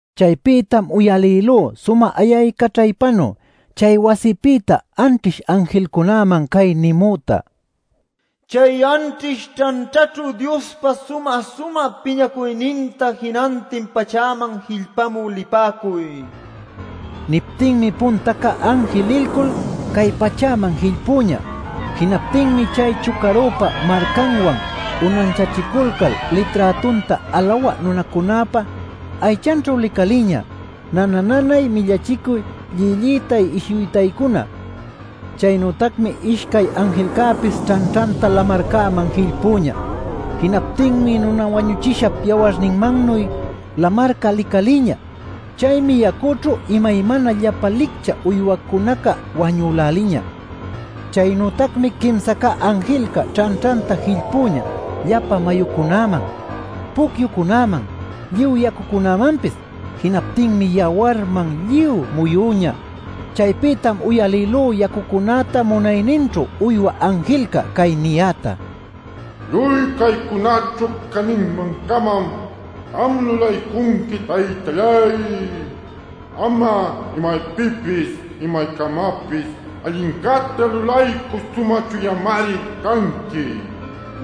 Chaypïtam uyalïlú sumä ayaycaćhaypanuy chay wasipïta anćhish anjilcunäman cay nimüta: “Chay anćhish ćhanćhaćhu Diospa sumä-sumä piñacuyninta jinantin pachäman jillpamü lipäcuy” nil. Niptinmi punta cä anjil lilcul cay pachäman jillpüñä. Jinaptinmi chay chucarüpa marcanwan unanchachiculcal liträtunta alawä nunacunäpa aychanćhu licalïñä nana-nanay millachicuy llillïtay ishuytaycuna. Chaynütacmi ishcay anjilcäpis ćhanćhanta lamarcäman jillpüñä. Jinaptinmi nuna wañuchishap yawarninnuy lamarca licalïñä. Chaymi yacućhu imaymana llapan licchä uywacunaca wañüläliñä. Chaynütacmi quimsa cä anjilca ćhanćhanta jillpüñä llapa mayucunäman, pucyucunäman, lluy yacumanpis. Jinaptinmi yawarman lluy muyüñä. Chaypïtam uyalïlú yacucunäta munayninćhu uywä anjilca cay niyäta: “Lluy caycunaćhu cäninman-camam am lulaycunqui, Taytalláy. Am'a imaypïpis imaycamapis allincäta lulaycü sumä chuyamari canqui.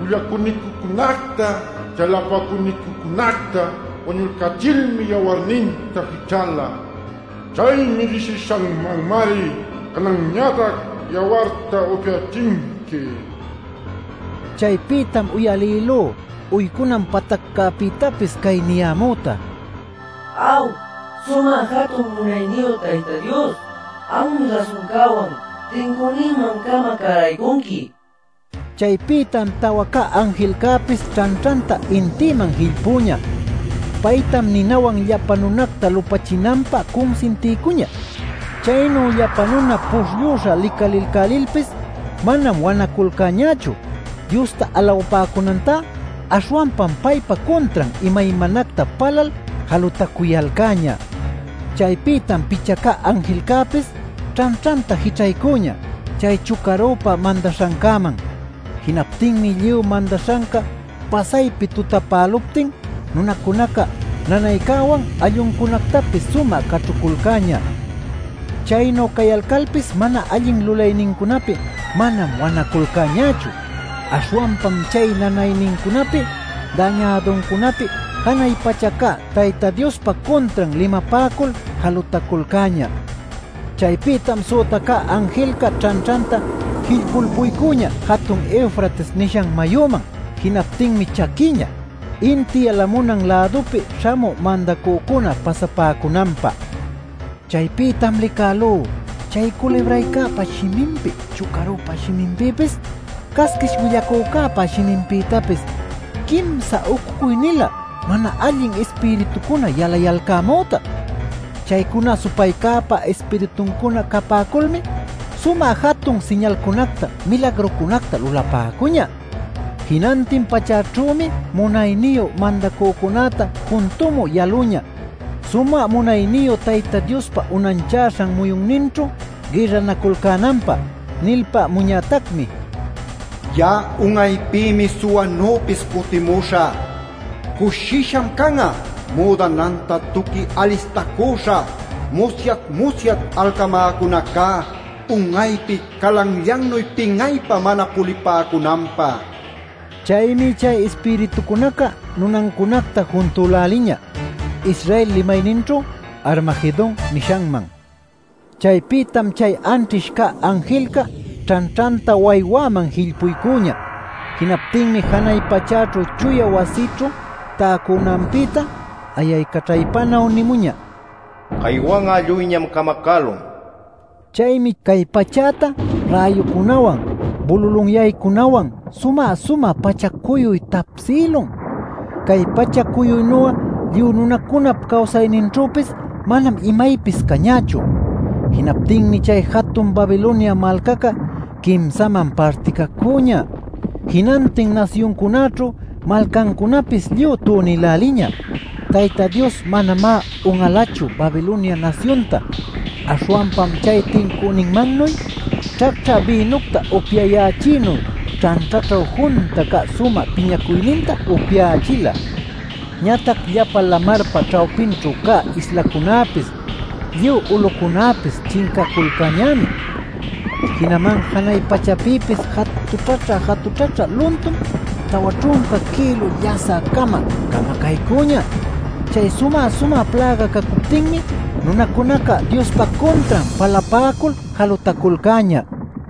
Willacüniquicunacta, chalapacüniquicunacta wañulcachilmi yawarninta jićhäla. Chay mirisishanmanmari cananñatac yawarta upyächinqui” nil. Chaypïtam uyalïlú uycunan pataccäpïtapis cay niyämüta: “Aw, sumä jatun munayniyu Tayta Dios, Anmi rasuncäwan, tincüninman-cama cäraycunqui” nil. Chaypïtam tawa cä anjilcäpis ćhanćhanta intïman jillpüñä. Paytam ninawan llapa nunacta lupachinanpä cunsintiycuñä. Chaynu llapa nuna puśhllüśha licalilcälilpis manam wanaculcäñächu; Diosta alawapäcunantá aśhwanpam paypa cuntran imaymanacta palal jalutacuyalcäñä. Chaypïtam picha cä anjilcäpis ćhanćhanta jićhaycüñä chay chucarüpa mandaśhancäman. Jinaptinmi lluy mandaśhanca pasaypi tutapäluptin nunacunaca nanaycäwan alluncunactapis sumä caćhuculcäñä. Chaynu cayalcalpis mana allin lulaynincunapi manam wanaculcäñächu; aśhwanpam chay nanaynincunapi dañäduncunapi janay pacha cä Tayta Diospa cuntran limapäcul jalutaculcäñä. Chaypïtam süta cä anjilca ćhanćhanta jillpulpuycüñä jatun Eufrates nishan mayuman. Jinaptinmi chaquïñä, inti yalamunan lädupi śhamü mandacücuna pasapäcunanpä. Chaypïtam licälú chay culibraycäpa shiminpi, chucarüpa shiminpïpis, casquish willacücäpa shiminpïtapis quimsa ucucuy-nilä mana allin ispiritucuna yalayalcämüta. Chaycuna supaycäpa ispirituncuna capäculmi sumä jatun siñalcunacta milagrucunacta lulapäcuñä. Jinantin pachäćhümi munayniyu mandacücunäta juntumü yaluñä sumä munayniyu Tayta Diospa unanchäśhan muyunninćhu gïrranaculcänanpä. Nilpämuñätacmi: “Ya'a un'aypïmi suwanüpis cutimuśhä; cushisham can'a müdananta tuqui alistacüśha musyat-musyat alcamäcunacá un'aypi calanllannuy pin'aypä mana pulipäcunanpä” nil. Chaymi chay ispiritucunaca nunancunacta juntüläliñä Israel limayninćhu “Armagedon” nishanman. Chaypïtam chay anćhish cä anjilca ćhanćhanta waywäman jillpuycüñä. Jinaptinmi janay pachäćhu chuya wasićhu täcunanpïta ayaycaćhaypanuy nïmuñä: “Caywan'a lluyñam camacälun” nil. Chaymi cay pachäta räyucunäwan, bululunyaycunäwan sumä-sumä pacha-cuyuy tapsïlun. Cay pacha-cuyuynu'a lluy nunacunap cawsayninćhüpis manam imaypis cañächu. Jinaptinmi chay jatun Babilonia malcaca quimsaman particacüñä, jinantin nasyuncunäćhu malcancunäpis lluy tunïläliñä. Tayta Dios manamá un'alachu Babilonia nasyunta, aśhwanpam chay tincüninmannuy ćhacćhä bïnucta upyayächïnuy ćhanćhaćhu junta cä sumä piñacuyninta upyächila. Ñatac llapa lamarpa ćhawpinćhu cä islacunäpis, lluy ulucunäpis chincaculcäñämi. Jinaman janay pachäpïpis jatućhaćhä-jatućhaćhä luntum tawa ćhunca kïlu llasä-cama camacaycüñä. Chay sumä-sumä pläga cacuptinmi nunacunaca Diospa cuntran palapäcul jalutaculcäñä.